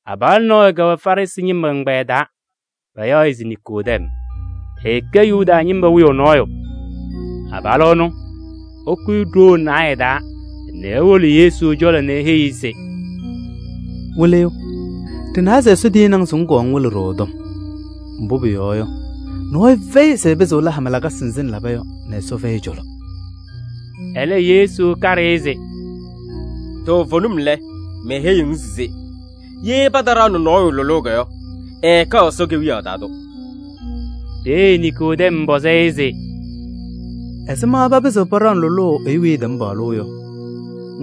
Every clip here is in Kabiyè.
Abalʋ nɔɔyʋ kɛwɛ Farɩsɩ ñɩma ɛgbɛyɛ taa, payaɣ-ɩ se Niikodɛm. Ɛkɛ Yuda ñɩma wiyaʋ nɔɔyʋ. Abalʋ ɛnʋ, ɛkʋyɩ ɖoo naayɛ taa nɛ ewolo Yesu cɔlɔ nɛ eheyi-i se: “Wɩlɩyʋ! Ɖɩnawa se Ɛsɔ tiyini-ŋ se ŋkɔɔ ŋwɩlɩ-ɖʋ ɛ-tɔm. Mbʋ pʋyɔɔ yɔ, nɔɔyʋ fɛyɩ se ɛpɩzɩɣ ɛla hama lakasɩ nzɩ ŋlaba yɔ nɛ Ɛsɔ fɛyɩ ɛ-cɔlɔ.” Ɛlɛ Yesu kaɖɩ-ɩ se: “Toovenim lɛ, meheyiɣ-ŋ se ye pataɖaɣnɩ nɔɔyʋ lʋlʋʋ yɔ, ɛɛkɛɣ Ɛsɔ Kewiyaɣ taa tʋ.” Peeye Niikodɛm pɔzɩ-ɩ se: “Ɛzɩma papɩzɩɣ paɖaɣnɩ lʋlʋʋ ɛyʋ weyi ɛtɛm paɣlʋʋ yɔ?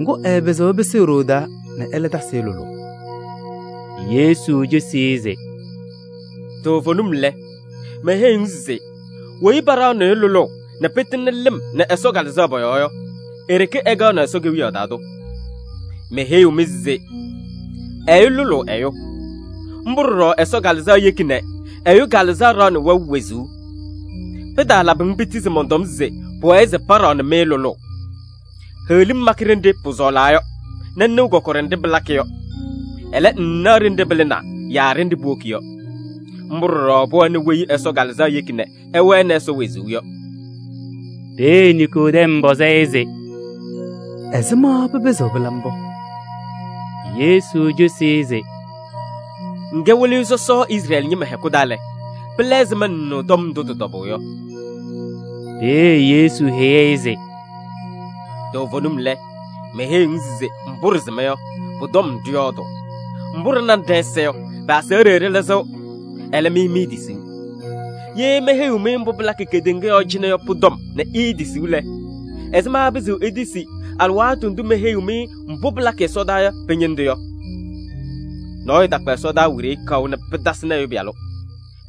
Ŋgʋ, ɛɛpɩzɩɣ ɛpɩsɩ e-ɖoo taa nɛ ɛlɛ tasɩ-ɩ lʋlʋʋ!” Yesu cosi-i se: “Toovenim lɛ, meheyiɣ-ŋ se weyi paɖaɣnɩɣ-ɩ lʋlʋʋ nɛ pɩtɩŋnɩ lɩm nɛ Ɛsɔ Kalɩzaɣ pɔ-yɔɔ yɔ, e-ɖeke ɛkɛɣnɩ Ɛsɔ Kewiyaɣ taa tʋ. Meheyiɣ-ŋ se: ɛyʋ lʋlʋʋ ɛyʋ. Mbʋ ɖɔɖɔ Ɛsɔ Kalɩzaɣ yeki nɛ ɛyʋ kalɩzaɣ ɖaɣnɩ wɛʋ wezuu. Pɩtaalabɩ-ŋ piti se mɔntɔm se pʋwɛɛ se paɖaɣnɩ-ŋ lʋlʋʋ. Heɣlim makɩ ɖenɖe pʋsɔɔlaa yɔ nɛ ŋnɩɣ kɔkɔɖɛ nɖɩ pɩlakɩ yɔ. Ɛlɛ, ŋŋnaɣ ɖenɖe pɩlɩnaa yaa ɖenɖe puwoki yɔ. Mbʋ ɖɔɖɔ pʋwɛnɩ weyi Ɛsɔ Kalɩzaɣ yeki nɛ ɛwɛnɩ Ɛsɔ wezuu yɔ.” Peeye Niikodɛm pɔzɩ-ɩ se: “Ɛzɩma pɩpɩzɩɣ pɩla mbʋ?” Yesu cosi-i se: “Ŋkɛ Wɩlɩyʋ sɔsɔ Izrɛɛlɩ ñɩma hɛkʋ taa lɛ, pɩla ɛzɩma ŋŋnɩɣ tɔm ndʋ tɩ-tɔbʋʋ yɔ?” Peeye Yesu heyi-i se: “Toovenim lɛ, meheyiɣ-ŋ se mbʋ ɖɩsɩma yɔ, pʋ-tɔm ɖɩyɔɔdʋʋ, mbʋ ɖɩnanɩ ɖɛ-ɛza yɔ, pɩ-aseɣɖe ɖɩlɩzɩɣ. Ɛlɛ, mɩ miitisiɣ. Ye meheyiɣ-mɩ mbʋ pɩlakɩ kedeŋa yɔɔ cɩnɛ yɔ pʋ-tɔm nɛ iitisiɣ lɛ, ɛzɩma ɩpɩzɩɣ itisi alɩwaatʋ ndʋ meheyiɣ-mɩ mbʋ pɩlakɩ ɛsɔdaa yɔ pɩ-ñɩndʋ yɔ? Nɔɔyʋ takpa ɛsɔdaa wiɖiyi kaʋ nɛ pɩtasɩnɩ Ɛyʋ Pɩyalʋ,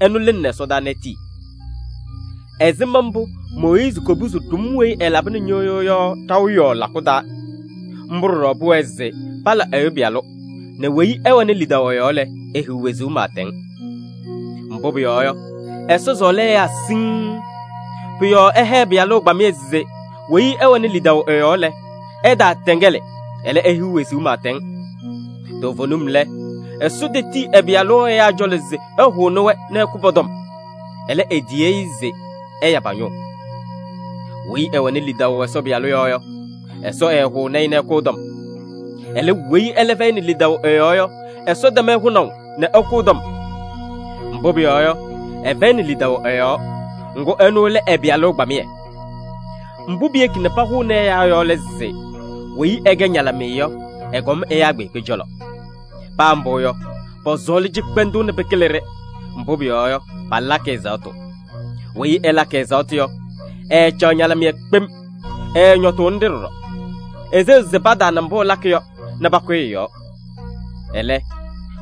ɛnʋ lɩnɩnɩ ɛsɔdaa nɛ etii. Ɛzɩma mbʋ Mooyiizi kopuzi ɖʋm weyi ɛlabɩnɩ ñɩɣyʋʋ yɔ ɖaʋ yɔɔ lakʋ taa, mbʋ ɖɔɖɔ pʋwɛɛ se pala Ɛyʋ Pɩyalʋ, nɛ weyi ɛwɛnɩ lidaʋ ɛ-yɔɔ lɛ, ehiɣ wezuu pɩɩtɛŋ. Mbʋ pʋyɔɔ yɔ, Ɛsɔ sɔɔlɩ ɛyaa siŋŋ. Pʋ-yɔɔ ɛha ɛ-Pɩyalʋ ɛgbamɩyɛ se weyi ɛwɛnɩ lidaʋ ɛ-yɔɔ lɛ, ɛtaatɛŋɛlɩ, ɛlɛ, ehiɣ wezuu pɩɩtɛŋ. Toovenim lɛ, Ɛsɔ tetiyi ɛ-Pɩyalʋ ɛyaa cɔlɔ se ɛhʋnɩ-wɛ nɛ ɛkʋ pɔ-tɔm. Ɛlɛ, etiyi-i se ɛya pa-ñʋʋ. Weyi ɛwɛnɩ lidaʋ Ɛsɔ Pɩyalʋ yɔɔ yɔ, Ɛsɔ ɛɛhʋʋnɩ-ɩ nɛ ɛkʋ ɛ-tɔm. Ɛlɛ, weyi ɛlɛ fɛyɩnɩ lidaʋ ɛ-yɔɔ yɔ, Ɛsɔ tɛm-ɩ hʋnaʋ nɛ ɛkʋ ɛ-tɔm. Mbʋ pʋyɔɔ yɔ, ɛfɛyɩnɩ lidaʋ ɛ-yɔɔ, ŋgʋ ɛnʋ lɛ ɛ-Pɩyalʋ ɛgbamɩyɛ. Mbʋ piyeki nɛ pahʋʋnɩ ɛyaa yɔ lɛ se: weyi ɛkɛ ñalɩmɩyɛ yɔ, ɛkɔm ɛyaa kpeekpe cɔlɔ. Paa mbʋ yɔ, pɔsɔɔlɩ cɩkpɛndʋʋ nɛ pɩkɩlɩ-ɖɩ, mbʋ pʋyɔɔ yɔ, palakɩ ɛzaɣtʋ. Weyi ɛlakɩ ɛzaɣtʋ yɔ, ɛɛcaɣ ñalɩmɩyɛ kpem, ɛɛñɔtʋʋnɩ-ɖɩ ɖɔɖɔ: eseɣ se pataana mbʋ ɛlakɩ yɔ nɛ pakʋyɩ ɛ-yɔɔ. Ɛlɛ,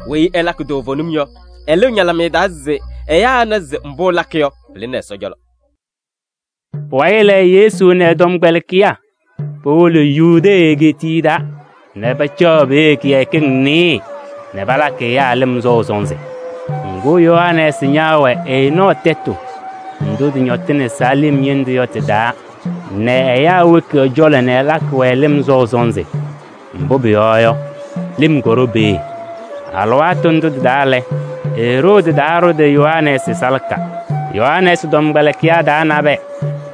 weyi ɛlakɩ toovenim yɔ, ɛlɩɣ ñalɩmɩyɛ taa se ɛyaa ɛna se mbʋ ɛlakɩ yɔ, pɩlɩnɩ Ɛsɔ cɔlɔ.” Pʋwayɩ lɛ, Yesu nɛ ɛ-tɔmkpɛlɩkɩyaa powolo Yudee egeetiye taa nɛ pacaɣ peeye kɩyakɩŋ nɩɩyɩ nɛ palakɩ ɛyaa lɩm sɔʋ sɔnzɩ. Ŋgʋ, Yohanɛɛsɩ ñaawɛ Enɔɔ tɛtʋ ndʋ tɩñɔtɩnɩ Salɩm ñɩndʋ yɔ tɩ-taa nɛ ɛyaa woki ɛ-cɔlɔ nɛ ɛlakɩ-wɛ lɩm sɔʋ sɔnzɩ. Mbʋ pʋyɔɔ yɔ, lɩm kɔɖɔ peeye. (Alɩwaatʋ ndʋ lɛ, Eroodi taɖʋdɩ Yohanɛɛsɩ salaka.) Yohanɛɛsɩ tɔmkpɛlɩkɩyaa taa nabɛyɛ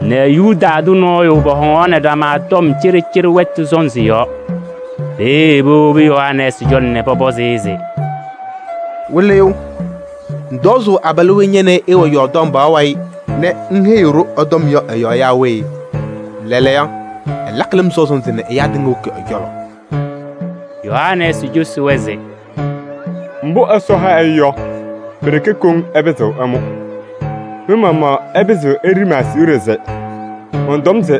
nɛ Yuda tʋ nɔɔyʋ, pɔhɔŋaɣnɩ ɖama tɔm cɩɖɩcɩɖɩ wɛtʋ sɔnzɩ yɔɔ. Peeye powobi Yohanɛɛsɩ cɔlɔ nɛ pɔpɔzɩ-ɩ se: “Wɩlɩyʋ! Ŋtɔzʋʋ abalʋ weyi ña nɛ ɩ ɩɩwɛ Yɔɔrdaŋ pɔɔ wayɩ nɛ ŋheyi-ɖʋ ɛ-tɔm yɔ ɛ-yɔɔ yaa we? Lɛɛlɛɛyɔ, ɛlakɩ lɩm sɔʋ sɔnzɩ nɛ ɛyaa tɩŋa woki ɛ-cɔlɔ!” Yohanɛɛsɩ cosi-wɛ se: “Mbʋ Ɛsɔ ha ɛyʋ yɔ, pi-ɖeke koŋ ɛpɩzɩɣ ɛmʋ. Mɩ-maɣmaɣ ɩpɩzɩɣ ɩlɩzɩ ma-aseɣɖe se mɔntɔm se: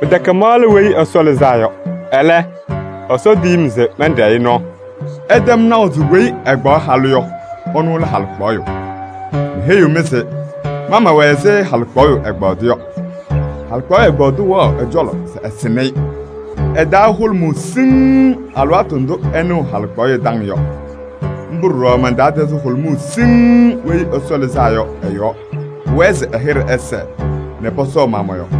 ‘Pɩtɛkɛ ma lɛ Weyi Ɛsɔ Lɩzaa Yɔ. Ɛlɛ, Ɛsɔ tiyi-m se mɛnɖɛɛ-ɩ nɔɔ.’ Ɩtɛm naʋ se weyi ɛkpaɣ halʋ yɔ, ɛnʋ lɛ halɩkpaɣyʋ. Meheyiɣ-mɩ se ma mɛwɛ ɛzɩ halɩkpaɣyʋ ɛgbaadʋ yɔ. Halɩkpaɣyʋ ɛgbaadʋ wɛɣ ɛ-cɔlɔ se ɛsɩnɩ-ɩ. Ɛ-taa hʋlʋmʋʋ siŋŋ alɩwaatʋ ndʋ ɛnɩɣ halɩkpaɣyʋ taŋ yɔ. Mbʋ ɖɔɖɔ man-taa tɛzɩ hʋlʋmʋʋ siŋŋ Weyi Ɛsɔ Lɩzaa Yɔ ɛ-yɔɔ. Pʋwɛɛ se ɛlɛ hɩɖɛ ɛsɛɛ nɛ pɔsɔɔ ma mɔ-yɔɔ.”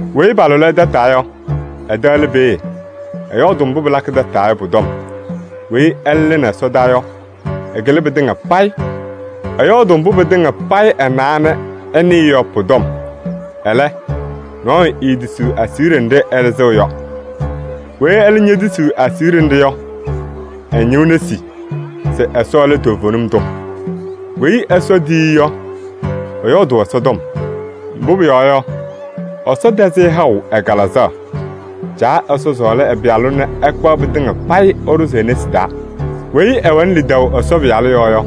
“Weyi palʋlɩ-ɩ tataa yɔ, ɛ-tɛ lɛ peeye, ɛyɔɔdʋʋ mbʋ pɩlakɩ tataa yɔ pʋ-tɔm. Weyi ɛlɛ lɩnɩ ɛsɔdaa yɔ, ɛkɩlɩ pɩtɩŋa payɩ. Ɛyɔɔdʋʋ mbʋ pɩtɩŋa payɩ ɛnawa nɛ ɛnɩɩ yɔ pʋ-tɔm. Ɛlɛ, nɔɔyʋ eetisiɣ aseɣɖe nɖɩ ɛlɩzɩɣ yɔ. Weyi ɛlɛ ñetisiɣ ɛ-aseɣɖe nɖɩ yɔ, ɛñɩɣ nesi se Ɛsɔ lɛ toovenim tʋ. Weyi Ɛsɔ tiyi-i yɔ, ɛyɔɔdʋʋ Ɛsɔ tɔm. Mbʋ pʋyɔɔ yɔ, Ɛsɔ tɛzɩ-ɩ haʋ ɛ-Kalɩzaɣ. Caa Ɛsɔ sɔɔlɩ ɛ-Pɩyalʋ nɛ ɛkpaɣ pɩtɩŋa payɩ ɛɖʋzɩ e-nesi taa. Weyi ɛwɛnɩ lidaʋ Ɛsɔ Pɩyalʋ yɔɔ yɔ,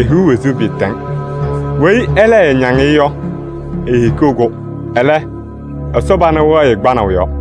ehiɣ wezuu pɩɩtɛŋ. Weyi ɛlɛ ɛɛñaŋ-ɩ yɔ, eehikiɣ-kʋ. Ɛlɛ, Ɛsɔ pana wɛɣ-ɩ kpanaʋ yɔɔ.”